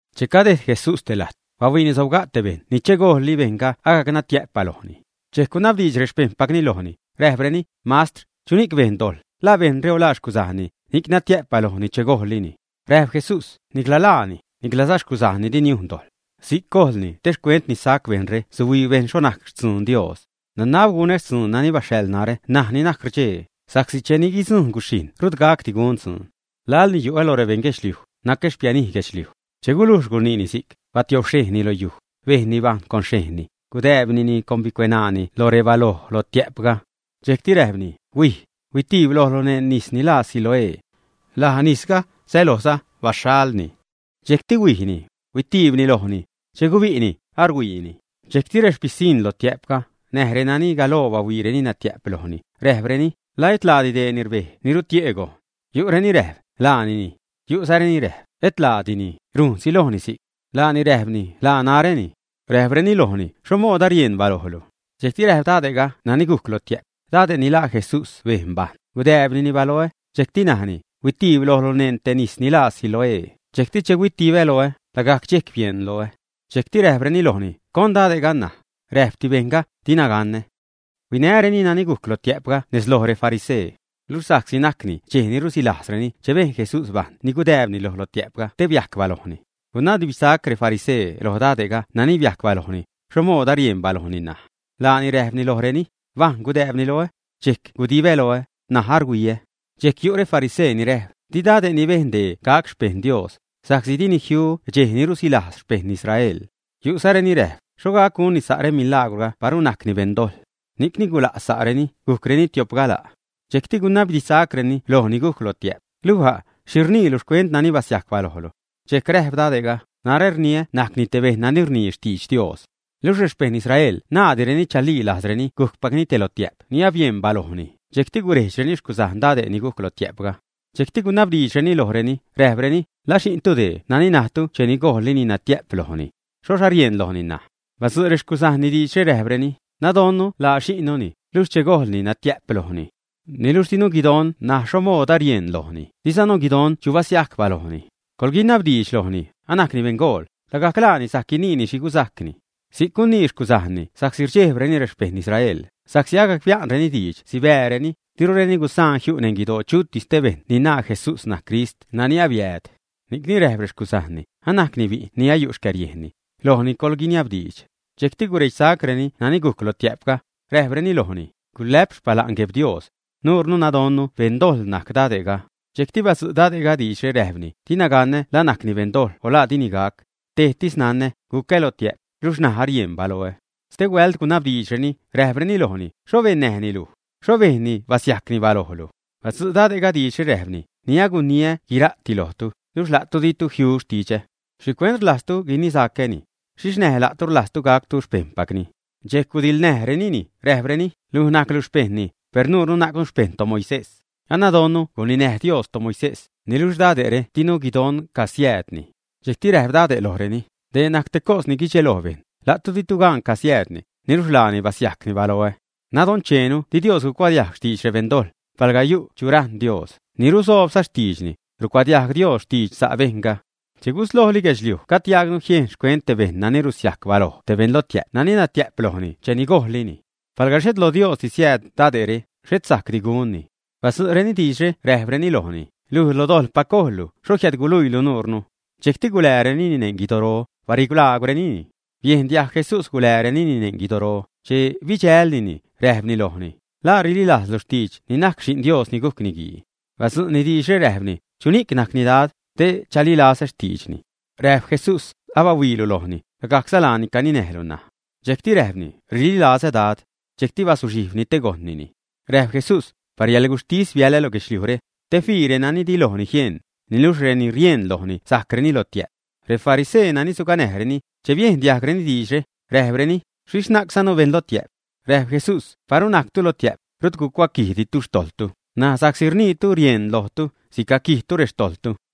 Che cadejd Jesús te lajt, bahuiini sobga' te bejṉ ni che gojlli bejṉga agajc natiä'p balojni. Dxejc gunabdiidx rexpejṉpacni lojni, räjpreni: ―Mastr, ¿chuni'c bejn dojḻ, la bejṉre o la xcuzajnni, ni'c natiä'p balojni che gojlni, ä? Räjp Jesús: ―Nicla laani, niclaza xcuzajnni di niujn dojḻ. Si'c gojlni te xcuent ni sajc bejṉre suhuii bejṉ xho najc xtzuun Dios. Nanab gunä xtzuun nani baxhaḻ narä ṉaj ni najc rdxee, sa'csi cheni guidzujṉ guxhijṉ rut gacdi gun dzuun. Laḻni yu'ä lo rebejṉ guedxliuj, nacä xpianij guedxliuj. Che gulujx guniini si'c, batiobxhejnni lo yuj, bejnni bajṉ con xhejnni, gudääbnini con bicueṉaani lo rebaloj lotiä'pga. Dxejcti räjpni: ―Huij, huitiib lojlu neṉ nis ni laa Siloé. Laj nisga sälojza “baxhaḻni”. Dxejcti huijni. Huitiibni lojni. Che gubi'ni, aruhuiini. Dxejcti rexpisiṉ lotiä'pga, näj renani galoo bahuiireni natiä'p lojni, räjpreni: ―¿La et laadi dee ni rbej te rutie'ni gojn, ä? Yu'reni räjp: ―Laanini. Yu'zareni räjp: ―Et laadini, rujnsi lojni si'c. Laani räjpni: ―Laa naräni. Räjpreni lojni: ―¿Xho mood arieṉ balojlu? Dxejcti räjp dade'ga nani gujc lotiä'p: ―Dade' ni laa Jesús bejn bajṉ, gudääbnini baloä, dxejcti najni: “Huitiib lojlu neṉ te nis ni laa Siloé”, dxejcti che huitibä loä, lagajc dxejc bieṉ loä. Dxejcti räjpreni lojni: ―¿Con dade'ga ṉaj? Räjpti bejṉga: ―Dina ganä. Huinäreni nani gujc lotiä'pga nez loj refarisee. Luxh sa'csi najcni dxej ni rusilajzreni che bejn Jesús bajṉ ni gudääbni loj lotiä'pga te biajc balojni, gunabdiidxsac refarisee loj dade' nani biajc balojni, xho mood arieṉ balojni ṉaj. Laani räjpni lojreni: ―Bajṉ gudääbni loä, dxejc gudibä loä, ṉaj aruhuiä. Dxejc yu' refarisee ni räjp: ―Di dade' ni bejn dee gac xpejṉ Dios, sa'csi dini jiu dxej ni rusilajz xpejṉ Israel. Yu'zareni räjp: ―¿Xho gac gunni sa' remilagwrga paru najcni beṉ dojḻ? Ni'cni gula' sa'reni, gujcreni tio'p gala'. Dxejcti gunabdidxsacreni lo ni gujc lotiä'p: ―Luj a', ¿xhi rniilu xcuent nani basiajc balojlu? Dxejc räjp dade'ga: ―Narä rniä najcni te bejṉ nani rnii xtidx Dios. Luxh rexpejṉ Israel naaddireni chalii lajzreni gujcpacni te lotiä'p ni abieṉ balojni, dxejcti gurejdxreni xcuzajn dade' ni gujc lotiä'pga. Dxejcti gunabdiidxreni lojreni, räjpreni: ―¿Laa xi'ntu dee nani najtu cheni gojllini natiä'p lojni? ¿Xhoxh arieṉ lojni ṉaj? Badzu' rexcuzajnni diidxre, räjpreni: ―Nadonnu laa xi'nnuni, luxh che gojlni natiä'p lojni. Niluxh dinu guidon ṉaj xho mood arieṉ lojni, dizanu guidon chu basiajc balojni. Coḻguiniabdiidx lojni, anajcni beṉgool, lagajc laani sajc guiniini xhi gusajcni. Si'c gunii xcuzajnni sa'csi rdxejbreni rexpejṉ Israel, sa'csi agac bia'nreni diidx sibääreni, dirureni gusaan jiu' neṉ guidoo chutis te bejṉ ni naa Jesús najc Crist nani abiääd. Ni'cni räjp rexcuzajnni: ―Anajcni bi'n ni ayu' xcäriejnni. Lojni coḻguiniabdiidx. Dxejcti guredxsacreni nani gujc lotiä'pga, räjpreni lojni: ―Gulä'p xpala'n Gueb Dios. Nuure nadonnu beṉ dojḻ najc dade'ga. Dxejcti badzu' dade'ga diidxre, räjpni: ―Dina ganä la najcni beṉ dojḻ o la dini gac. Tejtis nanä: gucä lotiä'p, luxh ṉaj arieṉ baloä. Stehuält gunabdiidxreni, räjpreni lojni: ―¿Xho bennäjni luj? ¿Xho bejnni basiajcni balojlu? Badzu' dade'ga diidxre, räjpni: ―Ni aguniä guira'ti lojtu, luxh la'tu ditu jiu xtidxä. ¿Xhicuent rlajztu guinisacäni? ¿Xhixh näj la'tu rlajztu gactu xpejṉpacni, ä? Dxejc gudiḻnäjrenini, räjpreni: ―Luj najclu xpejṉni, per nuure najcnu xpejṉ toMoisés. Anadonnu guninäj Dios toMoisés, niluxh dade're dinu guidon casiäädni. Dxejcti räjp dade' lojreni: ―Dee najc te cos ni guidxeloj bejṉ: la'tu ditu gan casiäädni, ¡niluxh laani basiajcni baloä! Nadoncheenu di Dios cuadiajg xtidx rebeṉ dojḻ; palga yu' chu rajṉ Dios, ni rusoobza xtiidxni, rucuadiajg Dios xtidx sa' bejṉga. Che guslojli guedxliuj gajd diajgnu jiejn xcuent te bejṉ nani rusiajc baloj te beṉ lotiä'p nani natiä'p lojni cheni gojllini. Palga xhet lo Diosdi siääd dade're, xhet sajcdi gunni. Badzu'reni diidxre räjpreni lojni: ―Luj, lo dojḻpac gojllu, ¿xho jiädluiilu nuure? Dxejcti guläärenini neṉ guidoro, barilaagwrenini. Biejn diajg Jesús guläärenini neṉ guidoro, che bidxälnini, räjpni lojni: ―¿La rililajzlu xtidx ni najc Xi'n Dios ni gujc Niguii, ä? Badzu'ni diidxre, räjpni: ―¿Chuni'c najcni, Dad, te chalilazä xtiidxni? Räjp Jesús: ―Abahuiilu lojni, lagajcza laani caninäjlu ṉaj. Dxejcti räjpni: ―Rililazä Dad. Dxejcti bazuxhijbni te gojṉnini. Räjp Jesús: ―Par yäḻguxhtis biälä lo guedxliujre, te fii renani di lojni jieṉ, niluxh reni rieṉ lojni sajcreni lotiä'p. Refarisee nani suganäjreni, che biejn diajgreni diidxre, räjpreni: ―¿Xhixh najczanu beṉ lotiä'p, ä? Räjp Jesús: ―Paru najctu lotiä'p, rut gucuaquijditu xtojḻtu, ṉaj sa'csi rniitu rieṉ lojtu, sicaquijtu rextojḻtu.